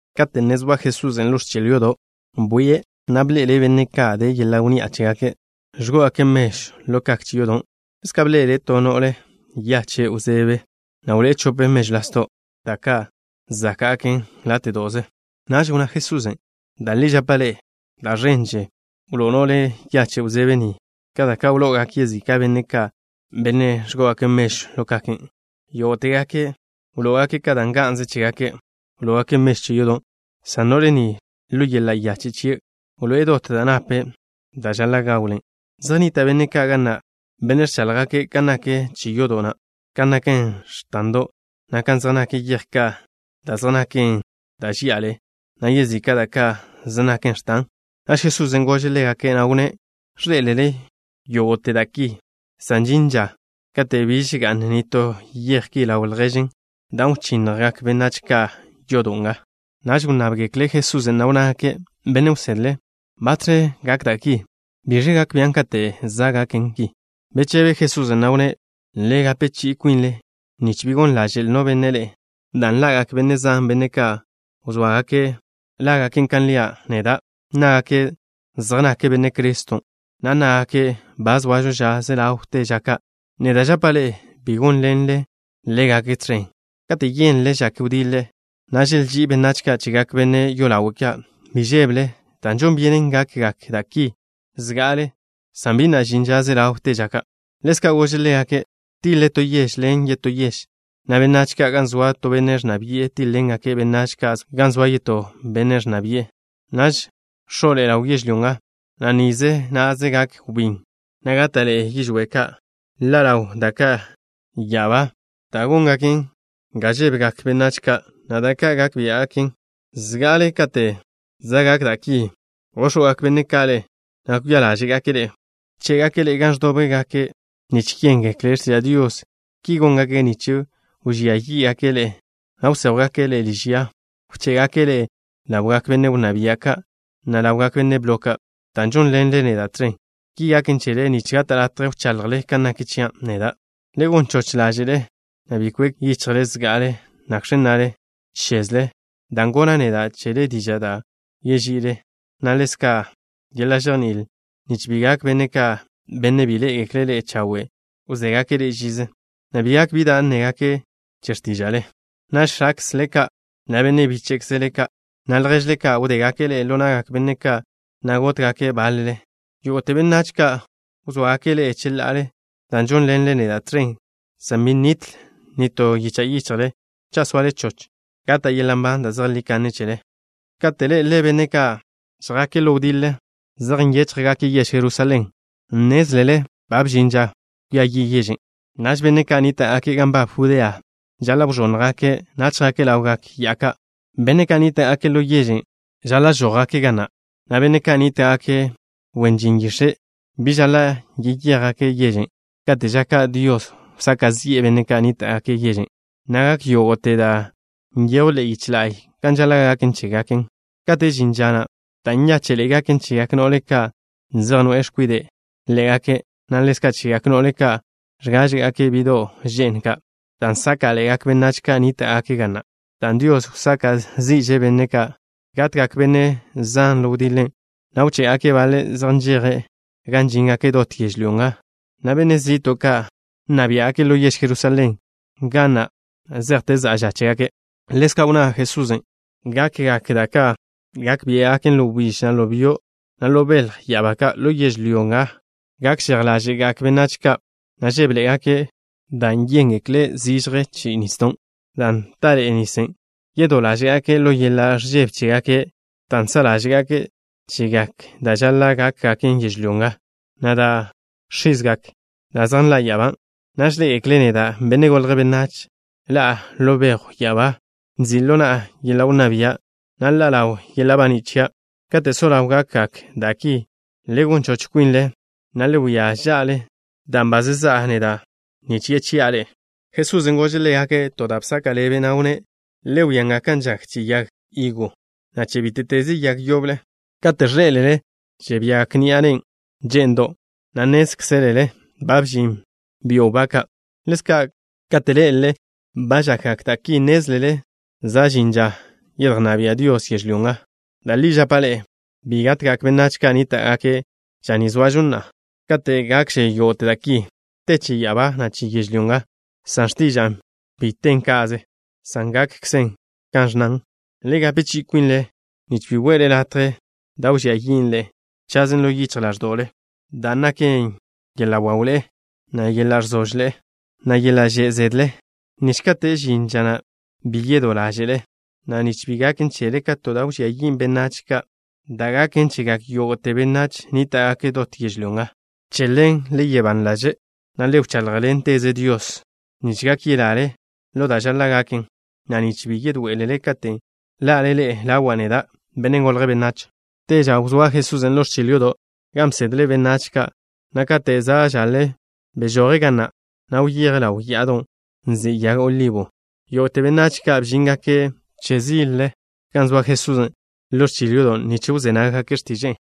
Kate' ne zoa Jesusen' ḻo ẕchil yodo', bwie', na' bḻe'ele' benne' ka' de yeḻa' wnni'a chégake', ẕgó'ogake' mežw ḻo kak che yodo'. Ḻezka' bḻe'ele' to no'le yache' wzebe, na' wloé'e chope mežw lasdo', da' ka' záka'gaken láte'do'ze. Naž wnná Jesusen': —Da' li žapa' ḻe'e, da' ẕenže wló'o no'le yache' wzebe ni ka da' wlo'ogak yezika' benne' ka', benne' ẕgó'ogake' mežw ḻo kaken'. Yógo'tegake', ka da' nga'nze chégake', wló'ogake' mežw che yodo', san no'le ni, ḻo yeḻa' yache' chie', wloé'e dot da' nape', da' žaḻa' gawlen'. Zej nnita' benne' ka' ga na', benne' ẕcháḻjgake' kan nak che yodo' na', kan naken x̱tando', na' kan zej naken yej ka' da' zej naken ẕenḻe'e, na' yezika' da' ka' zej naken x̱tan. Naž Jesusen' gože' ḻégake', na' wnné': —Ẕḻé'elele yógo'te da' ki, san žin ža katen' biž ga'n nitó yej ki ḻaw lježen, dan' wchinnjgak benách ka' yodo' nga. Naž wnnábgekle' Jesusen', na' wnnágake': —Benne' wsedle, ¿batẕe gak da' ki? ¿Biẕe gak bian' katen' za' gaken ki? Bechebe Jesusen', na' wnné': —Le gape chi'i kwinle, nich bi gon ḻaže'l no benne' ḻe'e, dan' ḻa'gak benne' zan, benne' ka' wzóa lágake' kan lia' neda'. Nnágake' zej nake' Benne' Criston', na' nnágake': “Ba zoažo ža ze ḻawte ža ka'.” Neda' žapa' ḻe'e: bi gónḻenle ḻégake' tẕen. Kate' yénlele žak wdiḻe, na' želží'i benách ka' chegak benne' yolawe' ka', bi žébele, dan' žon byenen gakgak da' ki zga'ale, san bi na' žin ža ze ḻawte ža ka'. Ḻezka' gože' ḻégake': —Tiḻe to yež ḻen yetó yež, na' benách ka' gan zoa to benne' ẕnna bi'e tíḻ-ḻengake' benách ka' gan zoa yetó benne' ẕnna bi'e. Naž x̱o'ḻe'e ḻaw yežlyó nga, na' nize na'ze gak wbín, na' gáta'ḻe'e yižwé' ka'. Ḻa' ḻawgak da' ka' ya'abá, da' góngaken ga žébegak benách ka', na' da' ka' gak biá'gaken. ’Zga'ale kate' za' gak da' ki, góx̱wgak benne' ka' ḻe'e, na' kwia ḻáže'gake' ḻe'e. Wché'gake' ḻe'e gan ẕdóbgake' nich yéngekle' x̱tiža' Dios. Ki góngake' nich wžía yí'gake' ḻe'e, na' wséjwgake' ḻe'e liž ya. Wché'gake' ḻe'e ḻawgak benne' wnná bia' ka', na' ḻawgak benne' blo ka', dan' žónḻenle neda' tẕen. Ki gaken chele nich gata' latje wchaḻjle ka nak chia' neda'. Le gon choch ḻáže'le, na' bi kwek yichjle zga'ale nakx̱ nnale chezle, dan' gonna' neda' chele diža' da' wži'ile, na' ḻezka' yeḻa' žejní'il, nich bi gak benne' ka', benne' bi ḻé'egekle' ḻe'e chawe', wzégake' ḻe'e žize, na' bi gak bi da' nnégake' che x̱tíža'le. Naž x̱akzle ka', na' benne' bíche'kzle ka', na' lježkzle ka', wdégake' ḻe'e ḻo na'gak benne' ka', na' gótgake' báḻele. Yógo'te benách ka' wzóagake' ḻe'e cheḻa'ale dan' žónḻenle neda' tẕen, san bi nitl nitó yicha' yichjle. Cha' soale choch, gata' yeḻa' nban da' zejlí kanne chele. ’Kate' ḻé'elele benne' ka' žjake' ḻo wdiḻe zej ngo'e ḻe'je yež Jerusalén, nnézlele ba bžin ža kwia yi' yežen'. Naž benne' ka' nníta'gake' gan nbab Judea žaḻa' wẕónnjgake', na' chjake' ḻawgak ya'a ka'. Benne' ka' nníta'gake' ḻo yežen' žaḻa' žójgake' ga na', na' benne' ka' nníta'gake' wen yix̱e', bi žaḻa' yeyéjgake' yežen'. Kate' ža ka' Dios wsaka' zi'e benne' ka' nníta'gake' yežen', na' gak yógo'te da' nyejwn ḻe'e yich la'y kan žaḻa' gaken chégake'. Katen' žin ža na', da' nyáche'ḻe'e gaken chegak no'le ka' zej noe'e x̱kwide' ḻé'egake', na' ḻezka' chegak no'le ka' ẕgáže'gake' bi'do' že'n ka', dan' sáka'ḻe'egak benách ka' nníta'gake' ga na', dan' Dios wsaka' zi'že' benne' ka'. Gatgak benne' zan ḻo wdiḻen', na' wché'gake' baḻe' zej nžeje' gan žíngake' dot yežlyó nga, na' benne' zi'to' ka' nna biá'gake' ḻo yež Jerusalén nga na' zejte za'a ža chégake'. Ḻezka' wnná Jesusen': —Gakgak da' ka' gak biá'gaken ḻo wbíž, na' ḻo byo', na' ḻo belj ya'abá ka'. Ḻo yežlyó nga gak žej ḻáže'gak benách ka', na' žébeḻe'egake', dan' yéngekle' chi'i zižje che nisdo', dan' taḻe'e nisen'. Yedó ḻáže'gake' ḻo yeḻa' ẕžebe chégake' dan' sa' ḻáže'gake' chegak da' žaḻa' gákgaken yežlyó nga, na' dan' x̱izgak da' zej nḻa' ya'abá. Naž ḻé'egekle' neda', Benne' Golje' Benách, ḻa'a ḻo bejw ya'abá, nzi' ḻo na'a yeḻa' wnná bia', na' ḻa' ḻaw yeḻa' baní' chia'. Kate' so ḻaw gakgak da' ki, le gon choch kwinle, na' le wia ža'le, dan' ba zezá'a neda', nich yechi'a ḻe'e. Jesusen' gože' ḻégake' to da' bzaka' ḻebe', na' wnné': —Le wia nga kan žak che yag higo, na' che bíte'teze yag yoble. Kate' ẕḻé'elele žiagak ni'a ne'n že'ndo', na' nnézkzelele ba ẕžin byo' wbá ka'. Ḻézka'kze, kate' ḻé'elele ba žakgak da' ki, nnézlele za' žin ža yedjnná bia' Dios yežlyó nga. ’Da' li žapa' ḻe'e, bi gatgak benách ka' nníta'gake' ža ni zoažo na'a, kate' gakže yógo'te da' ki. Te che ya'abá, na' che yežlyó nga, san x̱tiža'a, bi ten ka'ze, san gakkze kan ẕnnan. ’Le gape chi'i kwinle nich bi we'le latje da' wžía yin' ḻe'e chazen ḻo yichj ḻáẕdo'le, dan' naken yeḻa' wawḻe'e, na' yeḻa' ẕzožle, na' yeḻa' že' zedle, nich kate' žin ža na', bi yedó ḻáže'le, na' nich bi gaken chele ka to da' wžía yin' benách ka', da' gaken chegak yógo'te benách nníta'gake' dot yežlyó nga. Che ḻen, le soa ban ḻaže', na' le wcháḻjḻenteze Dios, nich gak yelale ḻo da' žaḻa' gaken, na' nich bi yedoé'elele katen' ḻa'le ḻe'e ḻawa' neda', Benne' Golje' Benách. Te ža wzóa Jesusen' ḻo ẕchil yodo', gan bsedle' benách ka', na' kate' za' žaḻe bežoje' ga na', na' wyeje' ḻaw ya'adon' nzin' Ya'a Yag Olibo. Yógo'te benách ka' bžíngake' ẕzile gan zoa Jesusen' ḻo ẕchil yodo' nich wzé nággake' x̱tiže'e.